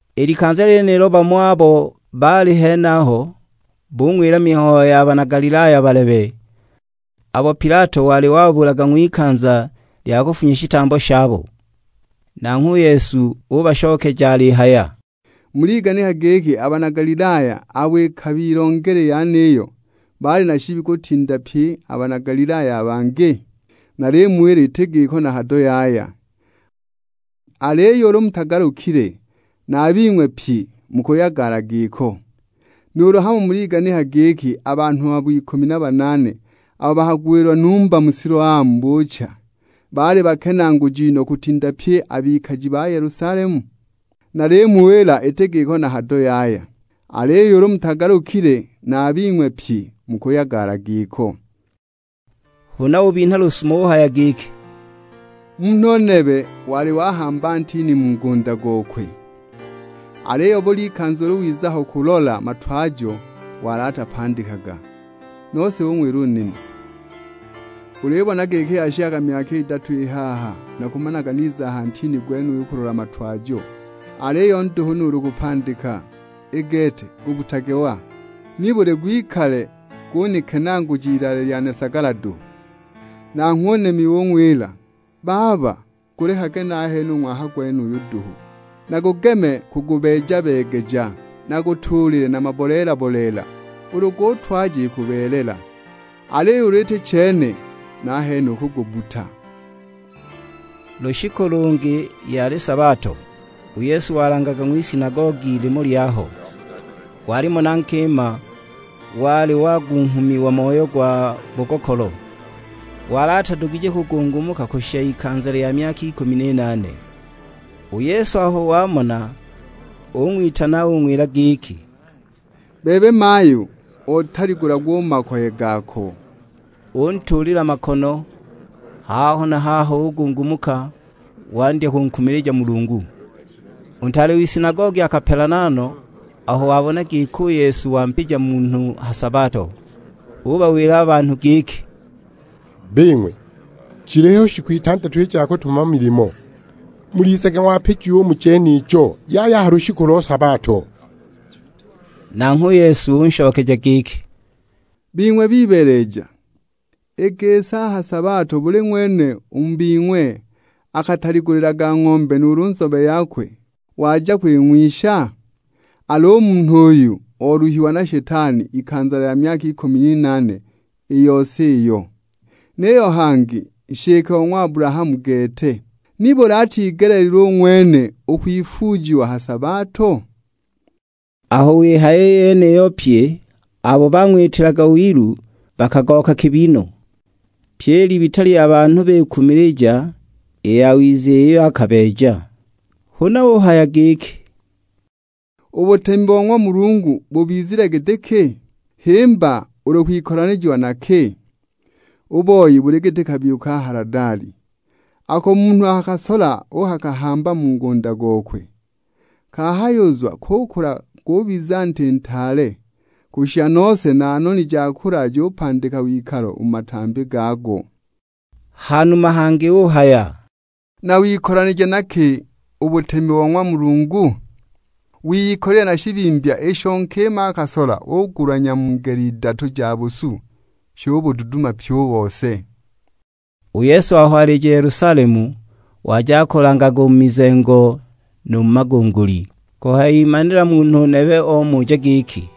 I likanza lyenilo, bamo abo baali henaho bung'wila mihayo ya bana Galilaya balebe, abo Pilato wali wababulaga ng'wikanza lya kufunya shitambo shabo! Nanghwe u Yesu ubashokeja alihaya, "Muliganika giki a bana Galilaya abo ikabilongela i yeniyo, baali na shibi kutinda pye a bana Galilaya a bangi? Nalimuwila iti giko na hado yaya, aliyo ulu mutagalukile, na a bing'we pyi mukuyagala giko! Nuulu hamo muliganika giki a banhu abo ikumi na banaane abo bakagwilwa numba mu Siloamu buucha, baali bakenaaguji no kutinda pye a bikaji ba Yelusalemu? Nalimuwila iti giko na hado yaya, aliyo ulu mutagalukile na a bing'we pyi mukuyagala giko!" Huna ubinha lusumo uhaya giki, "Munhu nebe wali wahamba ntini mu ngunda gokwe, aliyo buli ikanza ulu wiza ho kulola matwajo wali atapandikaga! Nose ung'wila u nimi, 'Ulibona giki yashikaga myaka idatu i haha nakumanaga niza a ha ntini gwenuyu kulola matwajo, aliyo nduhu nuulu kupandika; i gete gubbutage wa, nibuli gwikale gunikenaaguja ilaale lyane sagala duhu!' Nanghwe u nimi ung'wila, 'Baba, gulekage nahene u ng'waka gwenuyu duhu nagugeme kugubeeja-beegeja, nagutuulile na maboleela-boleela. Ulu gutwaja ikubeelela, aliyo ulu iti chene, nahene ukugubbuta!' " Lushiku lungi yali sabato, u Yesu walangaga ng'wisinagogi limo lyaho. Walimo na nkima wali wagunghumiwa moyo gwa bugokolo; wali atadugije kugungumuka kushisha ikanza lya myaka ikumi n'inaane! U Yesu aho wamona ung'witana ung'wila giki, "Bebe mayu otaligulagwa u mu makoye gako." Untuulila makono, haho na haho ugungumuka wandya kunkumilija Mulungu. U ntaale w'isinagogi akapelana no aho wabona giki u Yesu wampija munhu ha sabato, ubawila a banhu giki, "Bing'we, jiliho shiku itandatu i ja kutumama milimo, mulizage ng'wapijiwa u mu jenijo, yaya a ha lushiku lo sabato!" Nanghwe u Yesu unshokeja giki, "Bing'we bibeeleja, i gisi a ha sabato buli ng'wene u mu bing'we atataligulilaga ng'ombe nuulu nzobe yakwe waja kwing'wisha? Al'u munhu uyu oluhiwa na Shetani ikanza lya myaka ikumi n'inaane i yose iyo, niyo hangi nshike o ng'wa Abulahamu gete, nibuli atigeleelilwe u ng'wene u kwifuujiwa a ha sabato?" Aho wihaya i yeniyo pye abo bang'witilaga wilu bakagooka kibi no! Pyi i libita lya banhu bikumilija i yawiza iyo akabeeja. Huna uhaya giki, "U butemi bo ng'wa Mulungu bubizile giti ki? Himba ulu kuwikolanija na ki? U boi buli giti kabiyu ka haladali, ako munhu akakasola uukakahamba mu ngunda gokwe. Kahayuzwa kukula gubiza nti ntaale, kushisha nose na noni ja kulala jupandika wikalo u mu matambi gago." Hanuma hangi uhaya, "Nawikolanije na ki u butemi bo ng'wa Mulungu? Wiyikolile na shibimbya, isho nkima akasola ugulanya mu ngele idatu ja busu, shubududumya pyi u bose." U Yesu aho alija Yelusalemu, waja akulangaga u mu mizengo nu mu magunguli. Kuhayimanila munhu nebe omuja giki,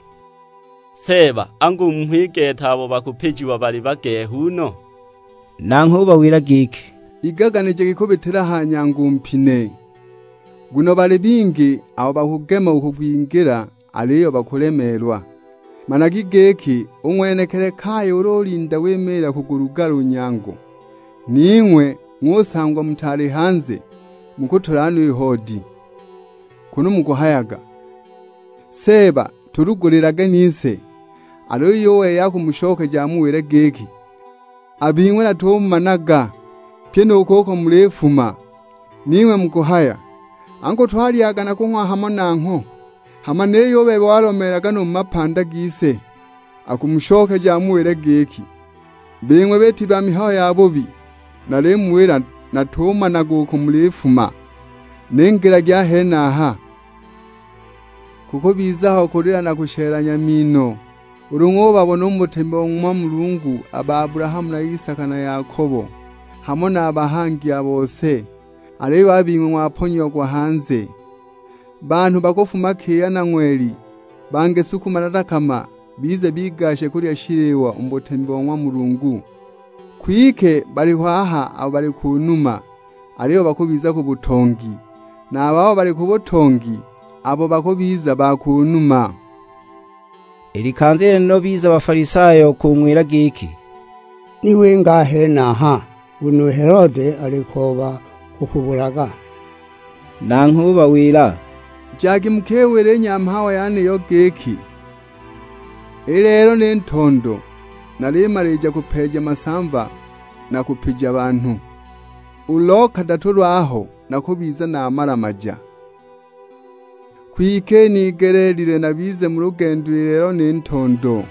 "Seeba, angu mmho i gete abo bakupijiwa bali bagehu no?" Nanghwe ubawila giki, "Igaganijagi u kubitila a ha nyango u mpine, nguno bali bingi abo bakugema u kwingila aliyo bakulemeelwa! Managi giki, u ng'wenekili kaya ulu ulinda wimiila kugulugala u nyango, ning'we ng'usangwa mutaali hanze, mukutula no i hoodi, kunu mukuhayaga; 'Seeba tulugulilage nise!' Aliyo u wei akumushokeja amuwile giki, 'A bing'we natumumanaga, pyi nu kuko mulifuma!' Ning'we mukuhaya, 'Angu twalyaga na kung'wa hamo nangho; hama niyo u bebe walomeelaga nu mu mapanda gise!' Akumushokeja amuwile giki, 'Bing'we biiti ba mihayo yabubi, nalimuwila natumanaga uko mulifuma, ningilagi a henaha!' Kukubiza ho kulila, na kushelanya mino; ulu ng'ubabona u mu butemi bo ng'wa Mulungu a ba Abulahamu na Isaka na Yakobo; hamo na a bahangi a bose, aliyo a bing'we ng'waponyiagwa hanze! Banhu bakufuma kiya na ng'weli, bangi sukuma na dakama bize bigashe kulya shiliwa u mu butemi bo ng'wa Mulungu. Kwike baliho aha abo bali ku numa, aliyo bakubiza ku butongi, na a babo bali ku butongi, abo bakubiza ba ku numa!" I likanza lyenilo biza Bafalisayo kung'wila giki, "Ni winga a henaha, nguno u Helode alikooba kukubulaga!" Nanghwe ubawila, "Jagi mukiwile i nyamhawa yeniyo giki, 'I lelo ni ntondo nalimalija kupeeja masamva na kupija banhu, u lo kadatu lwaho nakubiza namala-maja.' Kwike inigeleelilwe nabize mu lugendo i lelo ni ntondo,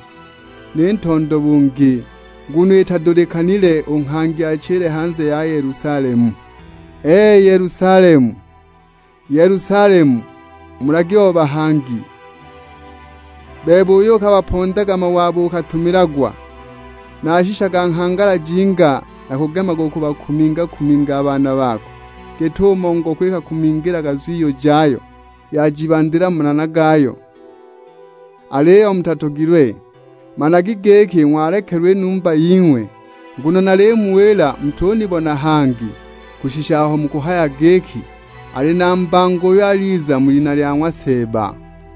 ni ntondo bungi; nguno itadulikanile u nghangi achile hanze ya Yelusalemu! Ee, Yelusalemu, Yelusalemu mulagi o bahangi; bebe uyo ukabapondaga mawe abo ukatumilagwa. Nashishaga nghangala jinga nakugemaga kubakuminga-kuminga a baana bako, git'umo ngoko ikakumingilaga zwiyu jayo, yajibandila mu manana gayo; aliyo mutatogilwe! Managi giki ng'walekelagwa i numba ying'we. Nguno nalimuwila mutunibona hangi kushisha aho mukuhaya giki, 'Ali na mbango uyo aliza mu lina lya ng'wa Seeba!' "